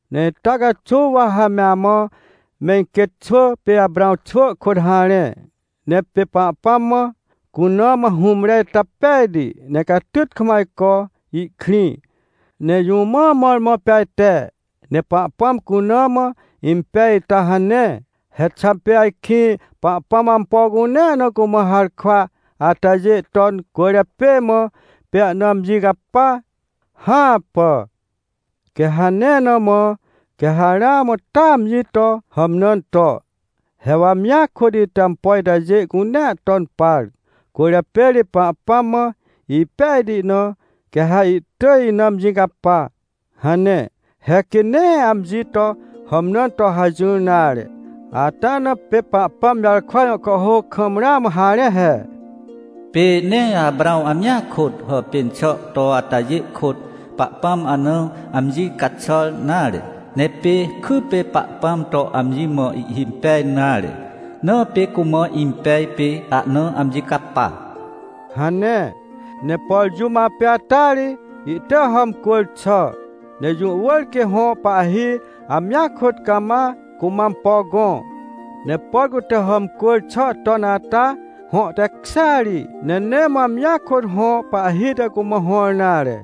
Ne ita caxuw wa ha me amã me iquêt xwỳ pê Aprãw xwỳ kôt harẽ. Ne pê Pahpãm mã, cuna mã hũmre ita pejti, ne catyt kam ajco ihkrĩ. Ne jũ mã mõrmõ pê ajte ne Pahpãm cuna mã impej ita hane? He xà pê ajkĩ Pahpãm ampo cunea na cumã harkwa atajê ton cwỳrjapê mã, pê ahna amji capa? Hãpà! Quê hane na mã, quê ha ramã taa amji to hàmnãn to: — He wa amjia kôt ite ampo itajê cunea ton par, cwỳrjapê ri Pahpãm mã ipejti na, quê ha ihtỳj ina amji capa — hane. He quê nee amji to hàmnãn to hajỹr nare. Ata na pê Pahpãm jarkwa jõ kàhhôc kam ramã harẽ he: “Pê nee Aprãw amjia kôt, hàpên xà to atajê kôt Pahpãm ahna amji caxàr nare. Ne pê kypê Pahpãm to amji mã ihhimpej nare, na pê cumã impej, pê ahna amji capa” hane. Ne por jũm apê ata ri, ihtỳj hàmcwỳr xà. Ne jũ wỳr quê hõ pahhi amjia kôt cama cumã ampo gõ. Ne por cute hàmcwỳr xà ton ata, hõ tekjêa ri, ne nee mã amjia kôt hõ pahhi te cumã hõr nare.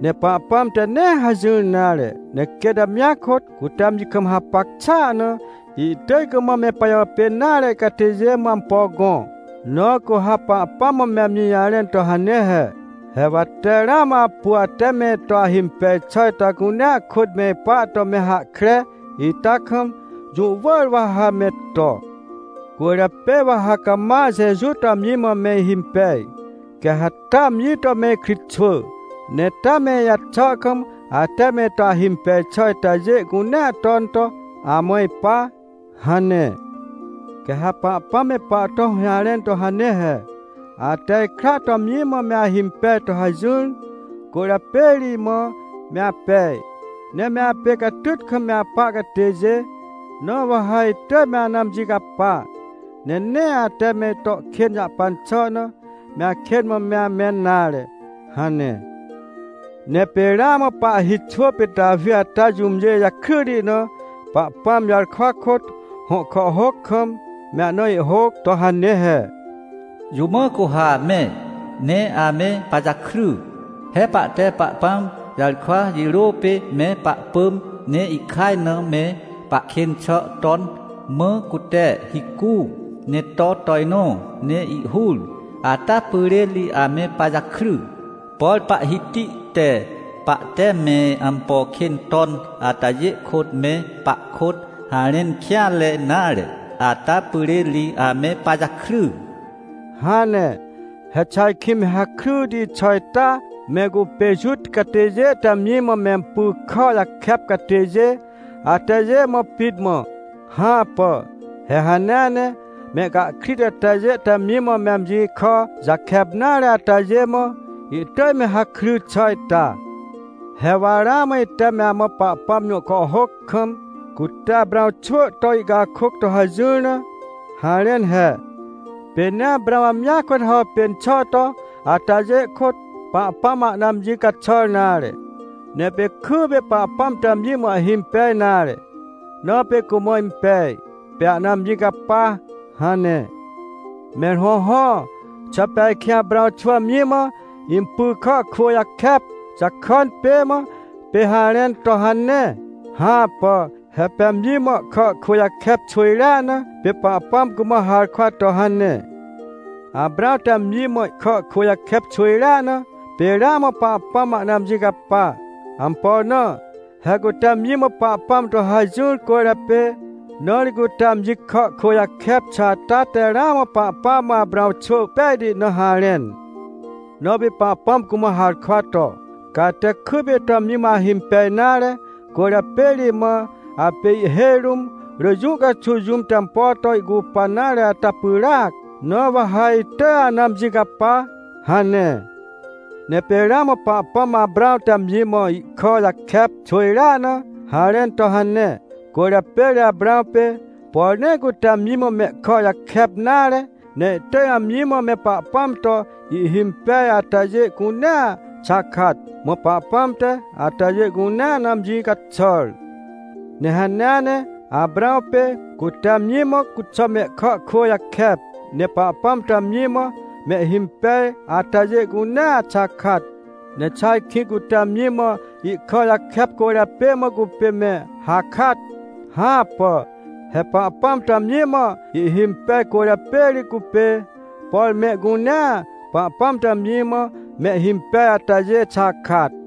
Ne Pahpãm te nee hajỹr nare, ne quêt amjia kôt, cute amji kam hapac xàa na, ihtỳj cumã me pajàpên nare catêjê mã ampo gõ. Na cu ha Pahpãm mã me amji jarẽn to hane he: — He wa tee ramã apu ate me ito ahimpej xà ita cunea kôt me ipa to me hahkre ita kam, jũ wỳr wa ha me to. Cwỳrjapê wa ha cama Jeju to amji mã me ihimpej, quê ha taa amji to me ikritxwỳ, ne taa me ijaxà kam ate me ito ahimpej xà itajê cunea ton to amã ipa — hane. Quê ha Pahpãm me pahto hũjarẽn to hane he: — Ate ikra to amji mã me ahimpej to hajỹr, cwỳrjapê ri imã me apej. Ne me apê catyt kam me apa catêjê, na wa ha itỳj me ana amji capa, ne nee ate me ito kên jahpan xà na, me akên mã me amẽn nare — hane. Ne pê ramã pahhi xwỳ pê Tawi ata jũmjê jakryti na, Pahpãm jarkwa kôt, hõ kàhhôc kam, me ahna ihhôc to hane he: “Jũ mã cu ha me, ne ame pajakry? He pahte Pahpãm jarkwa jirô pê me pahpỳm, ne ihkaj na me pahkên xà ton, mã cute hicu, ne to tojnõ, ne ihhur, ata pyrên ri ame pajakry. Por Pahhiti te pahte me ampo kên ton atajê kôt me pahkôt harẽn kêanre nare, ata pyrên ri ame pajakry” hane. He xà ajkĩ me hakryti xà ita me cupê Juta catêjê te amji mã mempy kà jakep catêjê atajê mã pit mã? Hãpà! He hanea ne mehcahkrit atajê te amji mã me amji kà jakep nare atajê mã, ihtỳj me hakry xà ita. He wa ramã ite me amã Pahpãm jõ kàhhôc kam, cute Aprãw xwỳ to ihcakôc to hajỹr na, harẽn he: “Pê nee Aprãw amjia kôt hàpên xà to atajê kôt, Pahpãm ahna amji caxàr nare. Ne pê kypê Pahpãm to amji mã ihhimpej nare, na pê cumã impej, pê ahna amji capa” hane. Mẽr hõhõ, xà pê ajkĩ Aprãw xwỳ amji mã impy kà kwỳ jakep jakàn pê mã, pê harẽn to hane? Hãpà! He pê amji mã ihkà kwỳ jakep xwỳjrea na, pê Pahpãm cumã harkwa to hane. Aprãw te amji mã ihkà kwỳ jakep xwỳjrea na, pê ramã Pahpãm ahna amji capa. Ampo na? He cute amji mã Pahpãm to hajỹr cwỳrjapê. Na ri cute amji kà kwỳ jakep xà ata te ramã Pahpãm mã Aprãw xwỳ pejti na harẽn. Na pê Pahpãm cumã harkwa to: “Ca ate kypê ito amji mã ahimpej nare, cwỳrjapê ri imã apê ihhêj rũm rỳ jũ caxuw jũm te ampo to ihcupan nare ata pyràac. Na wa ha itỳj ana amji capa” hane. Ne pê ramã Pahpãm Aprãw te amji mã ihkà jakep xwỳjrea na, harẽn to hane. Cwỳrjapê ri Aprãw pê, por nee cute amji mã mehkà jakep nare, ne ihtỳj amji mã me Pahpãm to ihhimpej atajê cunea xakat. Mã Pahpãm te atajê cunea na amji caxàr. Ne hanea ne Aprãw pê, cute amji mã cuxà mehkà kwỳ jakep, ne Pahpãm to amji mã mehhimpej atajê cunea xakat. Ne xà ajkĩ cute amji mã ihkà jakep cwỳrjapê mã cupê me hakat? Hãpà! He Pahpãm to amji mã ihhimpej cwỳrjapê ri cupê, por mehcunea Pahpãm to amji mã mehhimpej atajê xakat.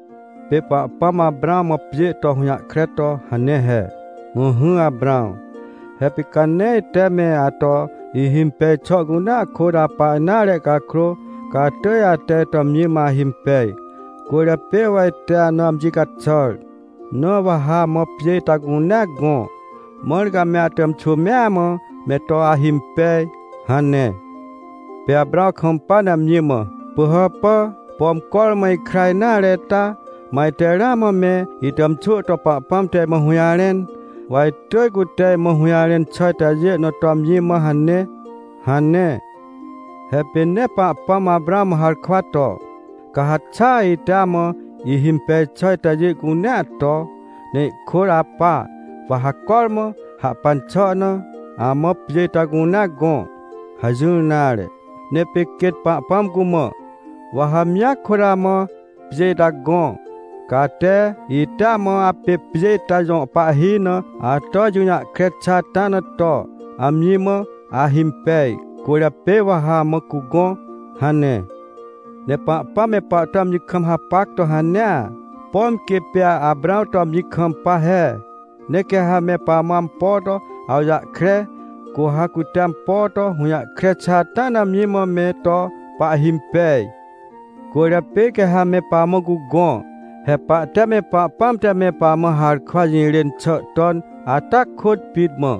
Pê Pahpãm Aprãw mã pjê to hũjahkre to hane he: — Ỹhỹ Aprãw, he pê ca nee ite me ato ihimpej xà cunea kôt apa nare cakrô, ca atỳj ate ito amji mã ahimpej, cwỳrjapê wa ite ana amji caxàr. Na wa ha amã pjê ita cunea gõ, mãr ca me atàmxwỳ mea mã me to ahimpej — hane. Pê Aprãw kampa ne amji mã: — Pỳhàpà, pom cormã ikra nare ita, mã ajte ramã me itàmxwỳ to Pahpãm te imã hũjarẽn. Wa itỳj cute imã hũjarẽn xà itajê na to amji mã hane — hane. He pê nee Pahpãm Aprãw mã harkwa to: — Ca ha xaa ite amã ihimpej xà itajê cunea to, ne ihkôt apa, wa ha cormã hahpan xà na, amã pjê ita cunea gõ — hajỹr nare. Ne pê quêt Pahpãm cumã: — Wa ha amjia kôt amã pjê ita gõ. Ca ate, ite amã apê pjê ita jõ pahhi na ato ijũjahkre xà ata na to, amji mã ahimpej, cwỳrjapê wa ha amã cugõ — hane. Ne Pahpãm me pahto amji kam hapac to hanea, pom quê pê Aprãw to amji kampa he. Ne quê ha me pamã ampo to awjahkre, cu ha cute ampo to hũjahkre xà ata na amji mã me to pahhimpej. Cwỳrjapê quê ha me pamã cugõ. He pahte me Pahpãm te me pamã harkwa jirên xà ton ata kôt pit mã,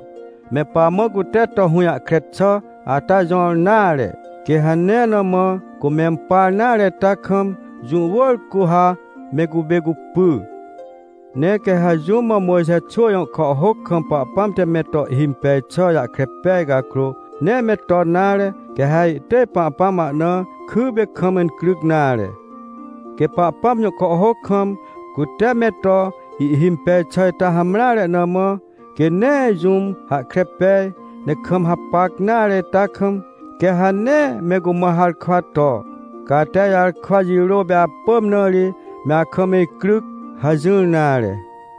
me pamã cute to hũjahkre xà ata jõr nare. Quê hane na mã, cu mempar nare ita kam, jũ wỳr cu ha me cupê cupy. Ne quê ha jũm mã Mojxe xwỳ jõ kàhhôc kam Pahpãm te me to ihhimpej xà jahkre pej cakrô, nee me ton nare, quê ha ihtỳj Pahpãm ahna kypê kam incryc nare. Quê Pahpãm jõ kàhhôc kam, cute me to ihhimpej xà ita hamreare na mã, quê nee jũm hahkre pej, ne kam hapac nare ita kam, quê ha nee me cumã harkwa to: — Ca ate ijarkwa jirô pê apỳm na ri me akam icryc — hajỹr nare.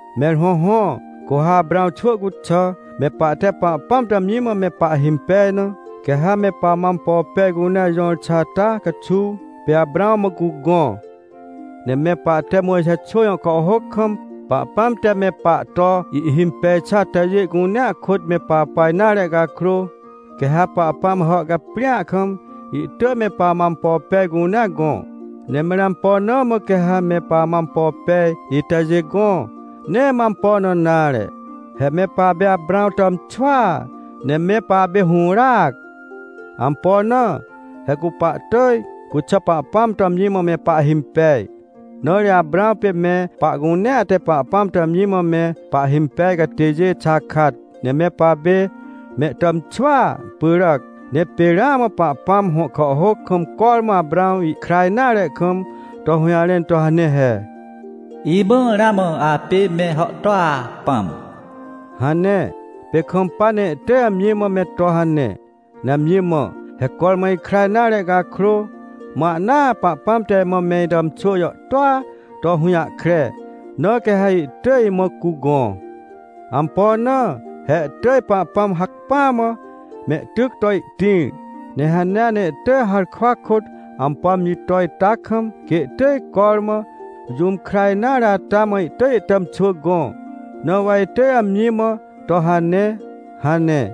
Mẽr hõhõ, cu ha Aprãw xwỳ cuxà, me pahte Pahpãm to amji mã me pahhimpej na, quê ha me pamã ampo pej cunea jõr xà ata caxuw, pê Aprãw mã cugõ. Ne me pahte Mojxe xwỳ jõ kàhhôc kam Pahpãm te me pahto ihhimpej xà atajê cunea kôt me papa nare cakrô, quê ha Pahpãm hàhcaprĩa kam ihtỳj me pamã ampo pej cunea gõ. Ne mẽr ampo na mã quê ha me pamã ampo pej itajê gõ? Nee mã ampo na nare. He me papê Aprãw tàmxwỳa, ne me papê hũràac. Ampo na? He cu pahtỳj, cuxà Pahpãm to amji mã me pahhimpej. Na ri Aprãw pê me pahcunea te Pahpãm to amji mã me pahhimpej catêjê xakat, ne me papê mehtàmxwỳa pyràc. Ne pê ramã Pahpãm, hõ kàhhôc kam cormã Aprãw ihkra nare kam to hũjarẽn to hane he: “Imãa, ramã apê me hàhtôa pãm” hane. Pê kampa ne ihtỳj amji mã me to hane, ne amji mã: “He cormã ikra nare cakrô, mã ahnaa Pahpãm te imã me itàmxwỳ jàhtôa to hũjahkre, na quê ha ihtỳj imã cugõ. Ampo na? He ihtỳj Pahpãm hacpỹa mã mehtyc to ihtĩr. Ne hanea ne ihtỳj harkwa kôt ampo amji to ita kam, quê ihtỳj cormã jũm kra nare ata mã ihtỳj ihtàmxwỳ gõ. Na wa itỳj amji mã to hane” hane.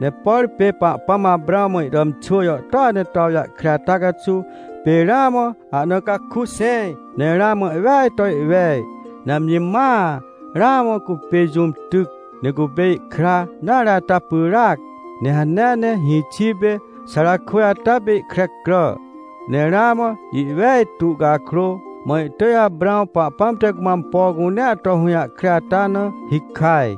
Ne por pê Pahpãm Aprãw mã ihtàmxwỳ jàhtôa ne to awjahkre ata caxuw, pê ramã ahna caku xẽj, ne ramã ihweaj to ihwej. Ne amji mãa ramã cupê jũm tyc, ne cupê ihkra nare ata pyràac, ne hanea ne hĩxi pê Xarakwỳj ata pê ihkre crà, ne ramã ihwejtu cakrô, mã ihtỳj Aprãw Pahpãm te cumã ampo cunea to hũjahkre ata na hikaj.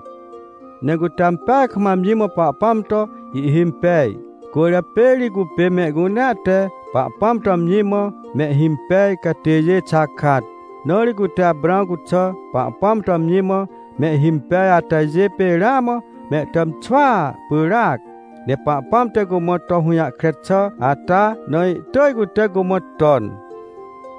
Ne cute ampeaj kam amji mã Pahpãm to ihhimpej, cwỳrjapê ri cupê mehcunea te Pahpãm to amji mã mehhimpej catêjê xakat. Na ri cute Aprãw cuxà Pahpãm to amji mã mehhimpej atajê pê ramã mehtàmxwỳa pyràc. Ne Pahpãm te cumã to hũjahkre xà ata, na ihtỳj cute cumã ton.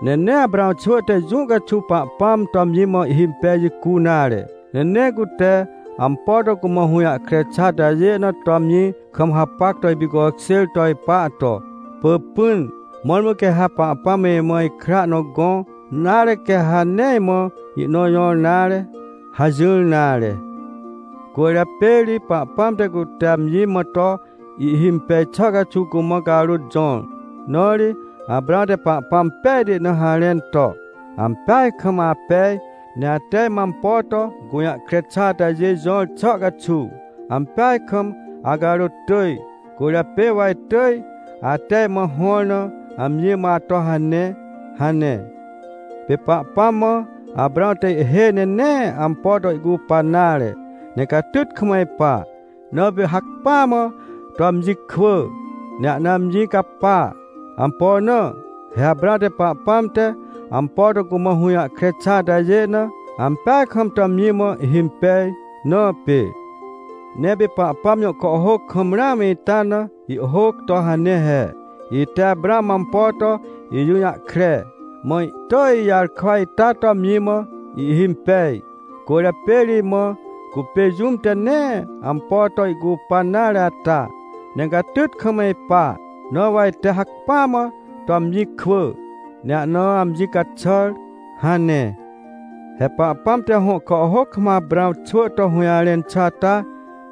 Ne nee Aprãw xwỳ te jũ caxuw Pahpãm to amji mã ihhimpej jicu nare, ne nee cute ampo to cumã hũjahkre xà atajê na to amji kam hapac to ipicokjêr to ipa to: — Pỳpỹn, mõrmõ quê ha Pahpãm imã ikra nõ gõ, nare, quê ha nee imã ihnõ jõr nare — hajỹr nare. Cwỳrjapê ri Pahpãm te cute amji mã to ihhimpej xà caxuw cumã carôt jõr, na ri Aprãw te Pahpãm pejti na harẽn to: — Ampeaj kam apej, ne ate imã ampo to gũjahkre xà atajê jõr xà caxuw, ampeaj kam acarôt tỳj, cwỳrjapê wa itỳj ate imã hõr na amji mã ato hane — hane. Pê Pahpãm mã, Aprãw te ihhêj ne nee ampo to ihcupan nare, ne catyt kam ipa, na pê hacpỹa mã to amji kwỳ, ne ahna amji capa. Ampo na? He Aprãw te Pahpãm te ampo to cumã hũjahkre xà atajê na, ampeaj kam to amji mã ihhimpej na pê. Ne pê Pahpãm jõ kàhhôc kam ramã ita na ihhôc to hane he: “Ite Aprãw mã ampo to ijũjahkre, mã ihtỳj ijarkwa ita to amji mã ihhimpej. Cwỳrjapê ri imã cupê jũm te nee ampo to ihcupan nare ata, ne catyt kam ipa. Na wa ite hacpỹa mã to amji kwỳ, ne ahna amji caxàr” hane. He Pahpãm te hõ kàhhôc kam Aprãw xwỳ to hũjarẽn xà ata,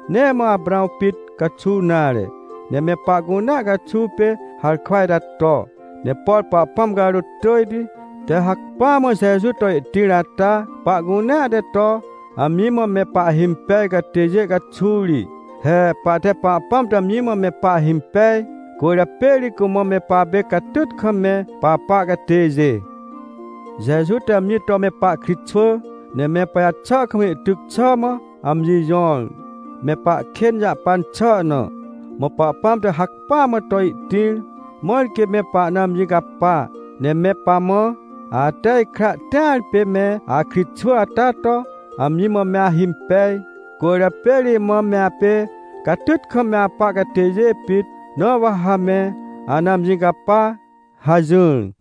nee mã Aprãw pit caxuw nare, ne me pahcunea caxuw pê harkwa ita to. Ne por Pahpãm carôt tỳjti te hacpỹa mã Jeju to ihtĩr ata, pahcunea te to amji mã me pahhimpej catêjê caxuw ri. He pahte Pahpãm to amji mã me pahhimpej, cwỳrjapê ri cumã me papê catyt kam me papa catêjê. Jeju te amji to me pahkritxwỳ, ne me pajaxà kam ihtyc xà mã amji jõr, me pahkên jahpan xà na. Mã Pahpãm te hacpỹa mã to ihtĩr, mãr quê me pahna amji capa, ne me pamã: — Ate ikra tĩar pê me akritxwỳ ata to amji mã me ahimpej, cwỳrjapê ri imã me apê catyt kam me apa catêjê pit, na wa ha me ana amji capa — hajỹr.